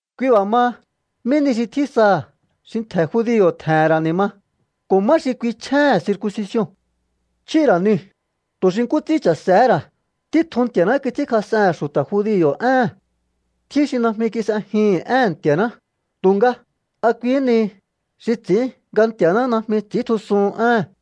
Kui b'a̱ maha, ¿mí ni xi tjín saha̱ xi ntje̱ judio̱ tje̱he̱n ra̱ ni̱ ma? ¿Ko̱ má xi kui chjéhe̱n circuncision? Chjíhi̱ ra̱ niu̱, tu̱ xi nkú ts'ín cha̱se̱hé ra̱á. Títjun Nti̱a̱ná kits'ínkjas'ehe̱n xu̱ta̱ judio̱ éhe̱n. Tjín xi najmi kis'ejihi̱n éhe̱n Nti̱a̱ná, tu̱nga, ¿a kuihí nihi xi ts'i̱ín nga Nti̱a̱ná najmi ts'i̱íntjusuhun éhe̱n?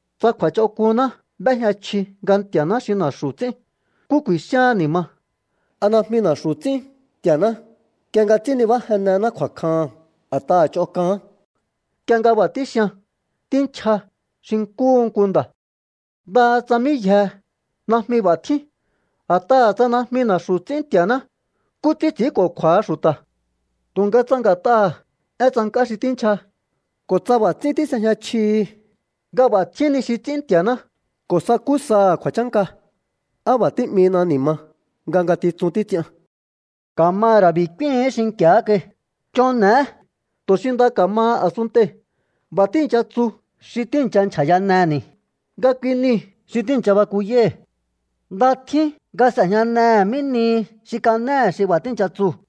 Tsa kju̱a̱ch'onk'unná b'éjña chji nga Nti̱a̱ná xi na̱xu̱ ts'ín, ¿nkú ku̱i̱xíaán ni̱ ma? ¿A najmi na̱xu̱ ts'ín Nti̱a̱ná nk'ie nga ts'ín nibájennená kju̱a̱kjaha̱n a̱t'aha̱ ch'on k'aán? Nk'ie nga b'a̱ tíxian, tínchja xi nkúhu nku nda̱. ¡Ndaha tsa mí yjehe najmi b'a̱ tjín! A̱t'aha̱ tsa najmi na̱xu̱ ts'ín Nti̱a̱ná, ¿nkú ts'ín ts'i̱ínko̱kju̱a̱ha xu̱ta̱? Tu̱nga tsa nga̱t'aha̱ én tsank'á xi tínchja, ko̱ tsa b'a̱ ts'ín tís'ejña chjihi nga b'a̱ tjín ni xi ts'ín Nti̱a̱ná ko̱ sakú saha̱ kju̱a̱chánka, ¿á b'a̱ tí'minaha̱ ni̱ ma nga ngatitsun títs'ian? Ka̱ ma ra̱ b'i̱ k'úíhi̱ín xinki̱á kai: “Ch'on n'e̱é tu̱ xi nda ka̱maha a̱sunntei̱.” B'a̱ tíi̱ncha tsu xi tíi̱ncha nchja̱yaneni̱ nga kui niu̱ xi tíi̱ncha bakuyái̱. Nda tjín nga s'e̱jñanehe̱ mí nihi xi kanéhe̱ xi b'a̱ tíi̱ncha tsuu̱.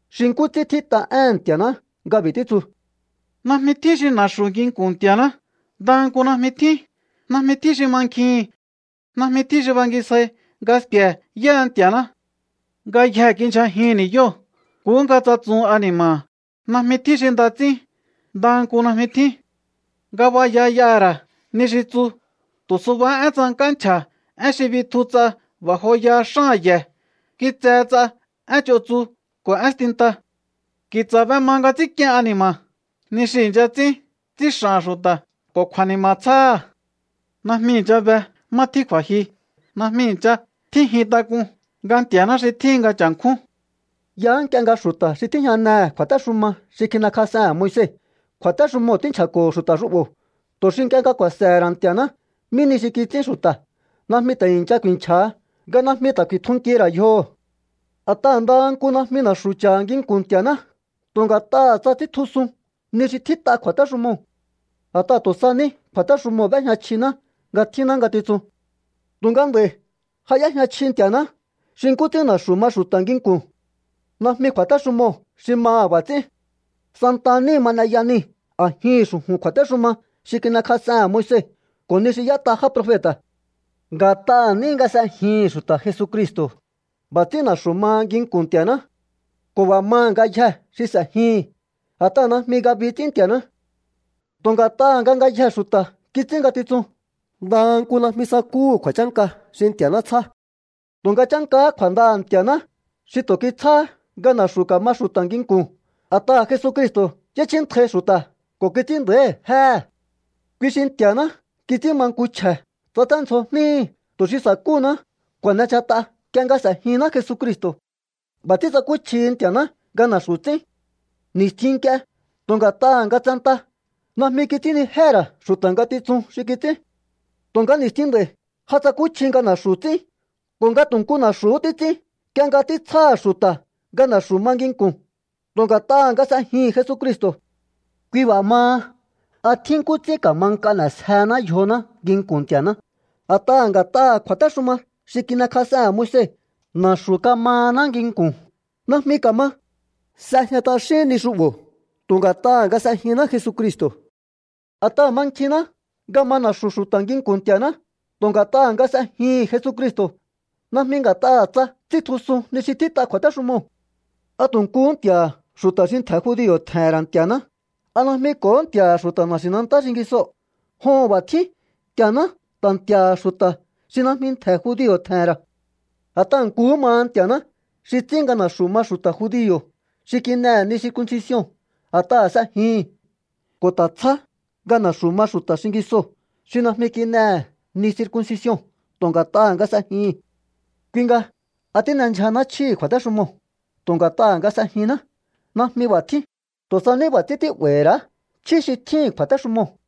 Xi nkú ts'ín tjít'a éhe̱n Nti̱a̱ná nga b'i̱ títsu: Najmi tjín xi na̱xu̱ nginku̱n Nti̱a̱ná, ndaha nku najmi tjín. Najmi tjín xi mankjihi̱n, najmi tjín xi bangisjai nga sku̱e̱ yáha Nti̱a̱ná. Ngayjee̱ kindyjajihi̱n ni̱yóo̱, nkuhú nga tsatsuhun ani̱ma̱ha̱. Najmi tjín xi nda ts'ín, ndaha nku najmi tjín. Ngabaya y'aha̱ ra̱ ni xi tsu, tu̱ subahá én tsank'á nchja̱. Én xi bitju ts'a b'a̱ joyaha xáha̱n ye̱, kitsehe ts'a én ch'on tsu ko̱ én stinta. Ki̱tsa̱ b'ema nga ts'ínk'ien ani̱ma̱, ni xi i̱ncha ts'ín ts'ín x'a̱ha̱n xu̱ta̱ ko̱ kju̱a̱ni̱ma̱ tsjáha̱. Najmi i̱ncha be má tjín kju̱a̱jyu, najmi i̱ncha tjínjin tak'un nga Nti̱a̱ná xi tjíhin nga cha̱nkjún. Yaá nk'ie nga xu̱ta̱ xi tíjñanehe̱ kju̱a̱téxuma xi kin'ekjas'ehe̱n Moise, kju̱a̱téxumoo̱ tínchja̱ko̱ho̱ xu̱ta̱ xu'bo̱ tu̱ xi nk'ie nga ku̱a̱se̱he̱ ra̱ Nti̱a̱ná mí nihi xi kits'ín xu̱ta̱ najmi ta̱ i̱ncha ku̱i̱nchja̱ha nga najmi ta̱ ku̱i̱tjunkihi̱ ra̱ yjoho̱. A̱t'aha̱ ndaha nku najmi na̱xu̱ cha̱ha̱ nginku̱n Nti̱a̱ná tu̱ nga̱t'aha̱ tsa ts'íntjusun ni xi tjít'a kju̱a̱téxumoo̱. A̱t'aha̱ tu̱ sa ní kju̱a̱téxumoo̱ b'éjña chjiná nga tjínná ngatitsun. Tu̱nga nd'a̱i̱ ja y'éjña chji Nti̱a̱ná xi nkú ts'ín na̱xu̱ ma xu̱ta̱ nginku̱n. Najmi kju̱a̱téxumoo̱ xi maha̱ b'a̱ ts'ín. Santa níhi ma n'eya nii̱ a̱jihi̱n xu̱ju̱n kju̱a̱téxuma xi kin'ekjas'ehe̱n Moise ko̱ ni xi y'ét'a já profeta̱. Nga̱t'aha̱ ní nga s'ejihi̱n xu̱ta̱ Jesucristo̱, b'a̱ ts'ín na̱xu̱ maha nginku̱n Nti̱a̱ná. Ko̱ b'a̱ maha̱ ngayjee̱ xi s'e̱jihi̱n, a̱t'aha̱ najmi ngabi ts'ín Nti̱a̱ná. Tu̱ nga̱t'aha̱ nga ngayjee̱ xu̱ta̱ kits'ín ngatitsun, ndaha nku najmi sakúhu̱ kju̱a̱chánka xi Nti̱a̱ná tsjá. Tu̱nga chánkahá kju̱a̱ndaha̱ Nti̱a̱ná xi tu̱ títsjáhá nga na̱xu̱ ka̱ma xu̱ta̱ nginku̱n, a̱t'aha̱ Jesucristo̱ y'échjíntjai xu̱ta̱ ko̱ kits'ín nda̱íhi̱ jéhe̱. Kui xi Nti̱a̱ná kits'ín ma nku chje̱. Tsaténdzjo jníhi̱ tu̱ xi sa̱kúhuná kju̱a̱n'endyjat'a nk'ie nga s'e̱jinná Jesucristo̱. B'a̱ ts'ín tsakúchjihi Nti̱a̱ná nga na̱xu̱ ts'ín. Ni̱stjin nk'ie, tu̱ nga̱t'aha̱ nga tsenta najmi kits'ínnijéhe̱ ra̱ xu̱ta̱ ngatitsun xi kits'ín. Tu̱nga ni̱stjin nd'a̱i̱ ja tsakúchji nga na̱xu̱ ts'ín ko̱ nga tu̱ nku na̱xu̱hú títs'ín nk'ie nga títsjáha̱ xu̱ta̱ nga na̱xu̱ ma nginku̱n tu̱ nga̱t'aha̱ nga s'ejihi̱n Jesucristo̱. Kui b'a̱ maha, ¿a tjín nkú ts'ín ka̱ma nk'a n'e̱sjehená yjoná nginku̱n Nti̱a̱ná a̱t'aha̱ nga̱t'aha̱ kju̱a̱téxuma xi kin'ekjas'ehe̱n Moise na̱xu̱ kamahaná nginku̱n? Najmi ka̱ma. S'ejña t'axín ni xu'bo̱ tu̱ nga̱t'aha̱ nga s'ejinná Jesucristo̱. A̱t'aha̱ mankjinná nga ma na̱xu̱ xu̱ta̱ nginku̱n Nti̱a̱ná tu̱ nga̱t'aha̱ nga s'ejihi̱n Jesucristo̱, najmi nga̱t'aha̱ tsa ts'íntjusun ni xi tjít'a kju̱a̱téxumoo̱. ¿A tu̱ nkuhú Nti̱a̱ha̱ xu̱ta̱ xi ntje̱ judio̱ tje̱he̱n ra̱ Nti̱a̱ná? ¿A najmi ko̱hó Nti̱a̱ha̱ xu̱ta̱ na̱xi̱nantá xingisoo̱? Joho̱n, b'a̱ tjín. Nti̱a̱ná ta̱ Nti̱a̱ha̱ xu̱ta̱ xi najmi ntje̱ judio̱ tje̱he̱n ra̱. A̱t'aha̱ nkuhú maha Nti̱a̱ná xi ts'ín nga na̱xu̱ ma xu̱ta̱ judio̱ xi kin'ehe̱ ni circuncision a̱t'aha̱ s'ejihi̱n, ko̱ ta̱ tsjá nga na̱xu̱ ma xu̱ta̱ xingisoo̱ xi najmi kin'ehe̱ ni circuncision tu̱ nga̱t'aha̱ nga s'ejihi̱n. Kui nga, ¿a tín'endyjanáá chjíhi̱ kju̱a̱téxumoo̱ tu̱ nga̱t'aha̱ nga s'ejinná? ¡Najmi b'a̱ tjín! Tu̱ sa ní b'a̱ ts'ín tí'ba̱i̱hi̱ ra̱á chjí xi tjíhi̱n kju̱a̱téxumoo̱.